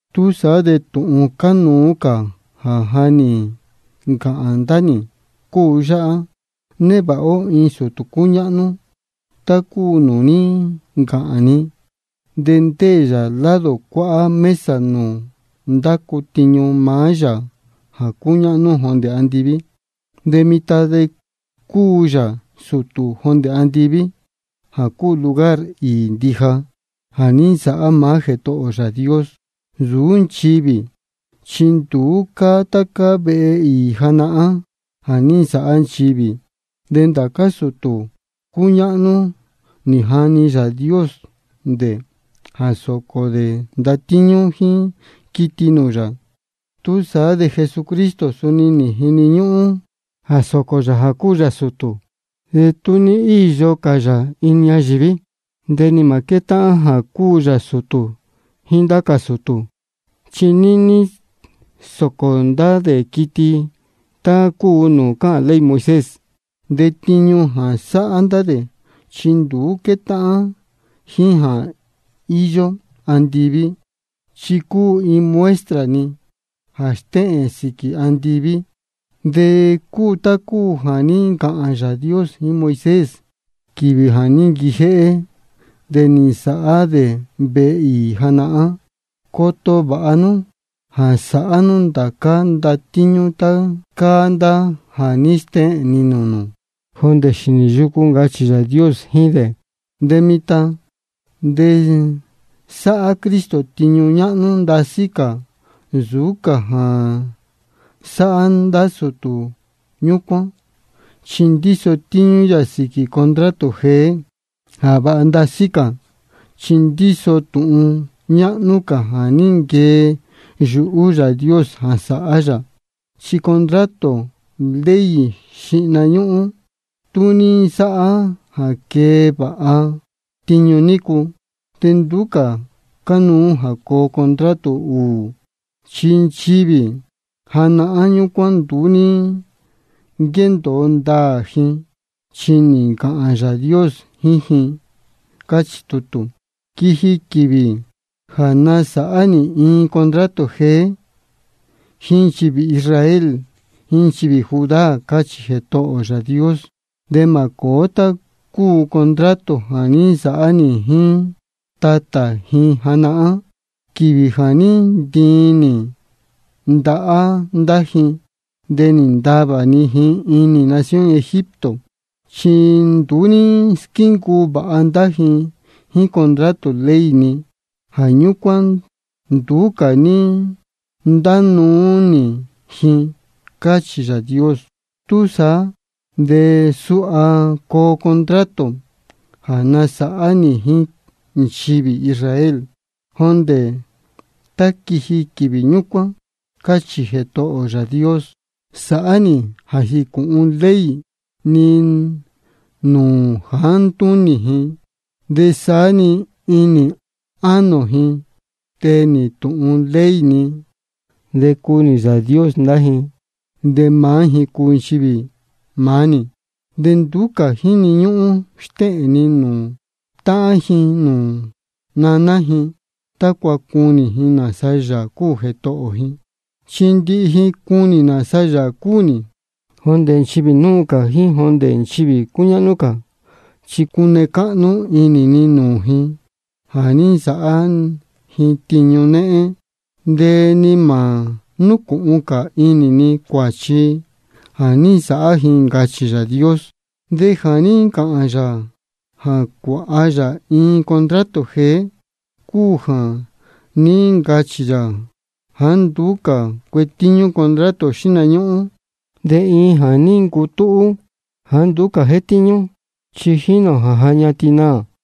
Túsaá de tūhun cánuú cā jā ja nī ncāhān ndá nī cúu yáhá: Névāha ó iin sūtū cúñáhnú tá cúu nūū ní ncāhān ni, de ndéē yā lado cuáhá mesa nūū ndácu tiñu maá Yāā jā cúñáhnú jondē andiví. De mitan de cúu yā sūtū jondē andiví, jā cúu lugar īī ndija jā ní nsāhá maá Jētohō ō Yāā Dios, nsūú nchivī. Chi nduú cáá tá cáá vehe īī janahán jā ní nsāhá nchivī. De ndācá sūtū cúñáhnú nī jani Yāā Dios dē jā sōcō dē ndatíñú jíín quiti nūū yā. Túsaá de Jesucristo suni nī jini ñúhún jā sōcō yā jā cúu yā sūtū. De tú ní íyo cā yā inī ñayīví, de ni mā quétáhán jā cúu yā sūtū jíín ndá cā sūtū, chi níní sócō cā ndá dē quiti tá cúu nūū cáhān ley Moisés. De tiñu jā sáhá ndá dē, chi nduú quétáhán jíín jā íyó andiví. Chi cúu iin muestra-ni jā stéhēn sīquī andiví. De cúu tá cúu jā ní ncāhān Yāā Dios jíín Moisés quīvī jā ní nquijéhé dē nī nsāhá dē vehe īī janahán: Coto vāha nú jā sāhá nú ndācá ndatíñú tá cáá ndá jā ní stéhēn ni nūū nū jondē xīnī yucu, ncachī Yāā Dios jíín dē. De mitan de sáhá Cristo tiñu ñáhnú ndasí cā nsūú cā jā sáhá ndá sūtū ñúcuán, chi ndíso tíñú yā sīquī contrato jeé jā vāha ndasí cā, chi ndíso tūhun ñáhnú cā jā ní nquee yuhú Yāā Dios jā sāhá yā. Chi contrato ley xíhna ñúhún, tú ní nsáhá jā quee vāha tiñu nícu, de nduú cā cánuú jā coo contrato ūū. Chi nchivī janahán ñúcuán nduú ní nquéndōo ndāā ji, chi nī ncāhān Yāā Dios jíín ji, cáchī tutū: Quiji quīvī jā nasāhá nī iin contrato jeé jíín nchivī Israel jíín nchivī Judá, cáchī Jētohō ō Yāā Dios. De mā cōó tá cúu contrato jā ní nsāhá nī jíín ndá tatā ji janahán, quīvī jā ní ntiin nī ndahá ndá ji, de nī ntavā ni ji inī nación Egipto. Chi nduú ní squíncuu vāha ndá ji jíín contrato ley ni. Jā ñúcuán nduú cā ní ntánuú nī ji, cáchī Yāā Dios. Túsaá de suha coo contrato jā nasāhá nī jíín nchivī Israel, jondē tá quiji quīvī ñúcuán, cáchī Jētohō ō Yāā Dios: Sāhá nī jā jīcūhun ley ni nūū jāá ntúnī ji, de saá-ni inī ánō ji tee nī tūhun ley ni. De cuu nī Yāā Dios ndá ji, de maá ji cuu nchivī maá nī. De nduú cā jíni ñúhún stéhēn ji nūū táhán ji nūū ñanī ji, tácua cunī ji nāsa Yāā cúu Jētohō ji. Chi ndihi ji cunī nāsa Yāā cúu nī, jondē nchivī núu cā jíín jondē nchivī cúñáhnú cā. Chi cune cáhnú inī ni nūū ji jā ní nsāhá ji tiñu néhén, de ni mā núcūhun cā inī ni cuāchi jā ní nsāhá ji. Ncachī Yāā Dios. De jā ní ncāhān yā jā cuāha yā iin contrato jeé cúu jā ní ncachī yā jāá nduú cā cuetíñú contrato xíhna ñúhún. De iin jā ní ncutúhú jāá nduú cā jétíñú, chi jínī ō jā ja ñatin naā.